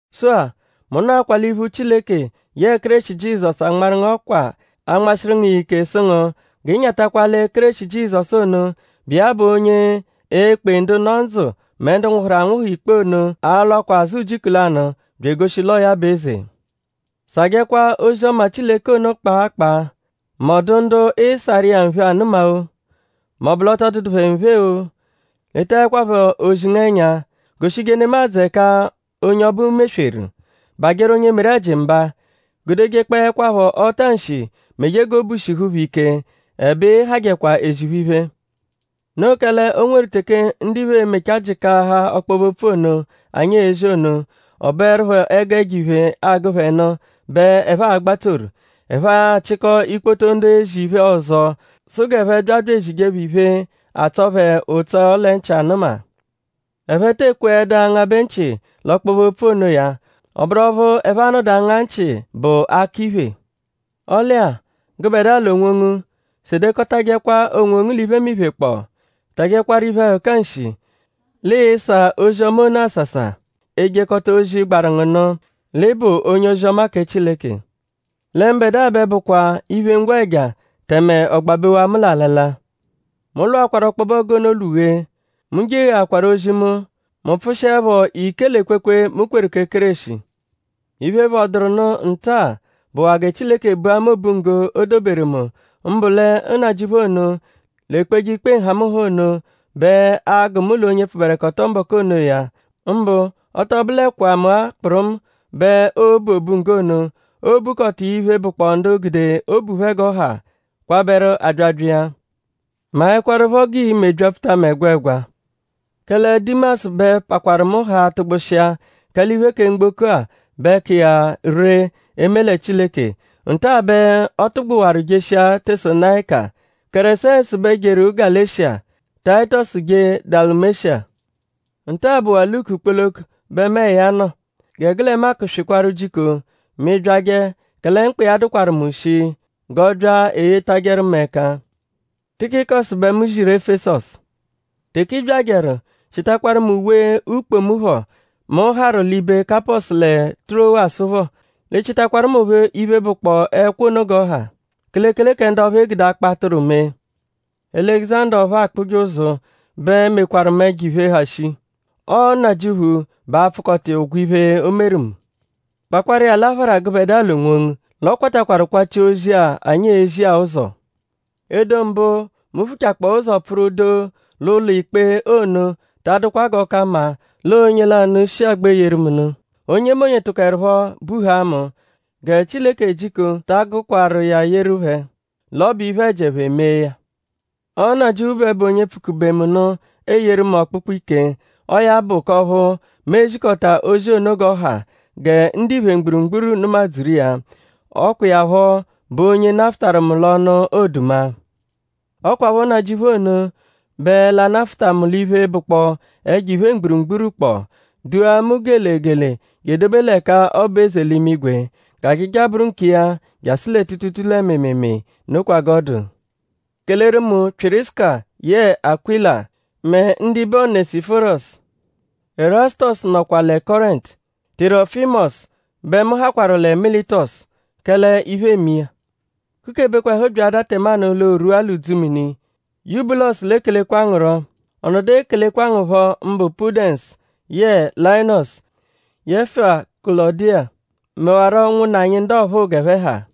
Sụ-a; mu nọakwa l'iphu Chileke yẹe Kéreshi Jizọsu anmarụ ngu ọkwa anmashiru ngu iya ike sụ ngu g'ị nyatakwa lẹ Kéreshi Jizọsu ono, bụ iya bụ onye e-kpe ndu nọ ndzụ mẹ ndu nwụhuru anwụhu ikpe ono a-lwakwa azụ ujiku lanụ bya egoshi l'ọo ya bụ eze. Sàjẹkwa ozi-ọma Chileke ono kpaa kpaa; m'ọ dụ ndu ịisaru iya nphe anụma-o; m'ọ bụ l'ọ tọ dụdu phẹ nphe-o; letaẹkwapho ozi ngu ẹnya. Goshije nemadzụ ẹka onye ọbu mesweru; bajẹru onye meru ẹji mba; gudejekpọekwapho ọta-nshi meje g'obu shihu phẹ ike; ẹbe ị hajẹkwa phẹ ezi iphe. Noo kẹle o nweru teke ndiphe e-mechaa jịkaaha ọkpobe-opfu ono, anyi ezi ono; ọ bụerupho ẹgu ẹjo-iphe, agụ phẹ nụ bẹ ẹphe a-gbatsoru. Ẹphe achịkoo ikpoto ndu ezi iphe ọzo sụ g'ẹphe bya bya ezije phẹ iphe, atsọ phẹ ụtso lẹ nchị anụma. Ẹphe te ekweẹdu angabẹ nchị l'ọkpobe-opfu onoya. Ọ bụru ọphu ẹphe a-nọdu anga nchị bụ akọ-iphè. Ọle-a; gụbedua l'onwongu; sedekọtajekwa onwongu l'iphemiphe kpọ; tajẹkwaru iphe-ẹhuka nshị; l'ịisà ozi-ọma ono àsàsà; ejekọta ozi, gbaru ngu nụ; l'ị bụ onye-ozi-ọma kẹ Chileke. Lẹ mbẹdua bẹ bụkwaa iphe-ngwẹja; tẹme ọ gbabewaa mu l'alala. Mu lwụakwaru ọkpobe ọgu ono lwụ-ghee. Mu jegheakwaru ozi mu. Mu pfụshiepho ike l'ekwekwe, mu kweru kẹ Kéreshi. Iphe, phọduru nụ nta-a bụwaa gẹ Chileke bua mu obunggo, o doberu mu; mbụ lẹ Nnajịuphu ono, l'ekpeje ikpe nhamụnha ono bẹ a-gụ mu l'onye pfụberekoto mbọku onoya. Mbụ ọ tọ bụlekwa mu-a kpụrumu bẹ oo-bu nggo ono; oo-bukọta iya iphe, bụkpoo ndu gude obu phẹ g'ọ ha kwabẹru abyabya iya. Maẹkwarupho g'ii-me byapfuta mu ẹgwegwa. Kẹle Dimasu bẹ pakwarụ mu haa tụgbushia; kẹle iphe kẹ mgboko-a bẹ ka iya ree eme lẹ Chileke. Nta-a bẹ ọ tụgbuwaru jeshia Tesalonayika. Keresensu bẹ jeru Galeshiya. Tayitọsu jee Dalumesha. Nta-a bụwaa Luku kpoloko bẹ muẹ ya nọ. Gẹ gụ lẹ Maku swịkwaru jiko mẹ ị -byajẹ kẹle mkpa iya dụkwaru mu shii; g'ọ bya eyetajẹru mu ẹka. Tikikọsu bẹ mu ziru Efesọsu. Teke ị byajẹru; chịtakwaru mu uwe-ukpo mu phọ, mu harụ l'ibe Kapọsu lẹ Tirowasu phọ. L'ị chịtakwaru mu phọ iphe, bụkpoo ẹkwo ono g'ọ ha; kelekele kẹ ndu ọphu e gude akpọ-atụru mee. Alẹguzanda ọphu akpụje ụzu bẹ mekwarụ mu ẹjo-iphe, ha shii. Ọo Nnajịuphu bẹ a-pfụkota iya ụgwo iphe, o meru mu. Kpakwaru iya l'aphara gụbedua l'onwongu; l'ọ kwatakwarụ kwachia ozi-a, anyi ezi-a ụzo. Edo mbụ, mu vuchakpọo ụzo pfụru doo l'ụlo-ikpe ono ta adụkwa g'ọ ka mma l'ọo onye lanụ shi agba eyeru mu nụ. Onyemonye tụkoerupho buhaa mu. Gẹ Chileke jiko ta agụkwaru iya yeru phẹ l'ọ bụ iphe-ẹji, ẹphe mee ya. Ọo Nnajịuphu bẹ bụ onye pfụ-kube mu nụ eyeru mu ọkpukpu ike; ọo ya bụ k'ọphu mu e-zikọta ozi ono g'ọ ha gẹ ndiphe mgburugburu nụma-dzuru iya. Ọ kwa iya phọ bụ onye nafụtaru mu l'ọnu oduma. Ọ kwaphọ Nnajịuphu ono bẹ l'a-nafụta mu l'iphe, bụkpoo ẹjo-iphe mgburugburu kpọ; dua mu gele gele je edobe l'ẹka ọ bụ eze l'imigwe. G'ajaja bụru nkiya jasụ lẹ tuutuutuu lẹ mịimiimii. Nokwa g'ọ dụ. Keleru mu Pyịrisuka yẹe Akwịla mẹ ndibe Onẹsiforosu. Ẹrasutosu nọkwa lẹ Kọrentu. Tirọfimosu bẹ mu hakwaru lẹ Militọsu; kẹle iphe eme iya. Kukebekwa ẹhu byaadaa tẹmanu l'o rwua l'udzumini. Yubulosu l'ekelekwa ngu rọ. Ọ nọdu ekelekwa ngu phọ mbụ Pudẹnsu yẹe Layinọsu; yẹfua Kulọdiya; mẹwaro ụnwunna anyi ndu ọphuu g'ẹphe ha.